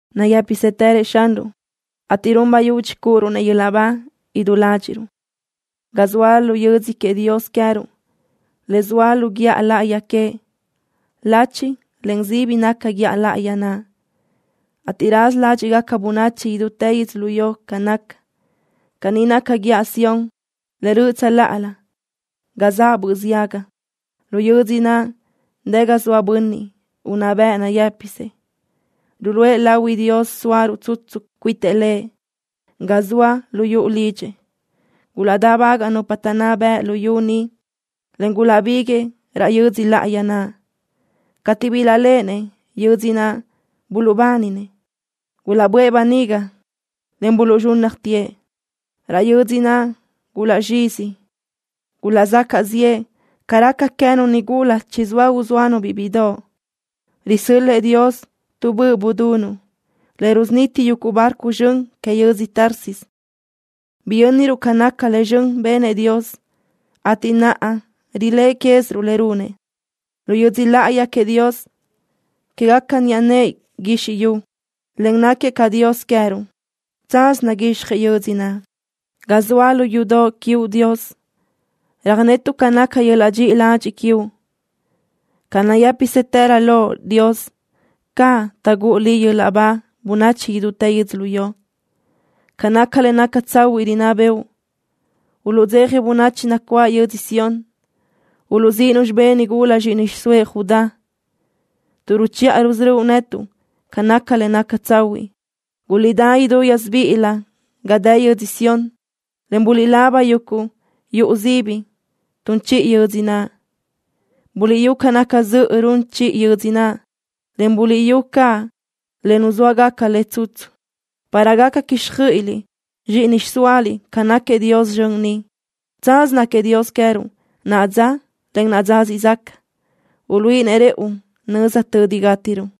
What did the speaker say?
Nayë́pisëtërëʼ Xanruʼ, ateʼ run bayudxi cúʼuruʼ-nëʼ yöl-laʼ ba idú ládxiʼruʼ ga zoa lu yödzö queëʼ Dios queë́ruʼ le zoa lu guíʼa láʼayi queëʼ. Lachi, en sibi naca guíʼa láʼayi naʼ, ateʼ raza ládxiʼgaca bönachi idútë yödzölió ca naca. Caní naca guíʼa Sión le röʼö tsöláʼalö ga zaʼ böʼ ziaga. Lu yödzö naʼ dë ga zoa Bönniʼ Unná Bëʼ nayë́pisëʼ. Ruluʼë lahui Dios sóaruʼ tsutsu cuitëʼ Lëʼ ga zoa lu yuʼu lidxëʼ. Gulaʼdáʼbagaʼ nupa taʼnná bëʼ lu yu ni, en gulaʼbíguiʼë raʼ yödzö láʼayi naʼ. Cateʼ bilaʼléʼenëʼ yödzö naʼ buluʼbáninëʼ. Gulaʼböʼë böniga, en laʼ buluʼzxúnnajtëʼ. Raʼ yödzö naʼ gulaʼzxíziëʼ. Gulaʼzacaʼ ziʼë ca raca queë́nu nigula chizóa uzóanu-biʼ bíʼidoʼ. Risö́l-lëʼë Dios tu böʼ budunuʼ, le rusuniti yuguʼ barco zxön que yödzö Tarsis. Biyönruʼ ca nácagaca le zxön benëʼ Dios, ateʼ naʼa riléʼe quéziruʼ le runëʼ, lu yödzö láʼayi queëʼ Dios quégaca niʼa nëʼë guizxi yu, en náquiëʼ caʼ Dios queë́ruʼ. Tsaz naguixjëʼ yödzö naʼ. Ga zoa lu yudoʼ quiuʼ, Dios, röjnetuʼ ca naca yöl-laʼ dxiʼi ladxiʼ quiuʼ. Ca nayë́pisëtërö Loʼ, Dios, caʼ taʼgúʼu Liʼ yöl-laʼ ba bönachi idútë yödzölió. Ca naca le naca tsahuiʼ rinná bëʼu. Uluʼdzeja bönachi nacuáʼ yödzö Sión. Uluʼzíʼinu xibé nigula zxíʼini xiʼsóëʼ Judá tuʼ ruchiʼa rusörö́uʼ netuʼ ca naca le naca tsahuiʼ. Guliʼdá idú gásibiʼilö ga dë yödzö Sión, en buliʼlaba yuguʼ yuʼu sibi tun chiʼi yödzö naʼ. Buliʼyú ca naca zöʼö run chiʼi yödzö naʼ, en buliʼyú caʼ le nuzóagaca le tsutsu, para gaca quíxjöiʼiliʼ zxíʼini xiʼsóaliʼ ca náquiëʼ Dios zxön ni. Tsaz náquiëʼ Dios queë́ruʼ, naʼa dza, en dza siʼ zaca. Uluíʼinëʼ rëʼu nöza tödi gátiruʼ.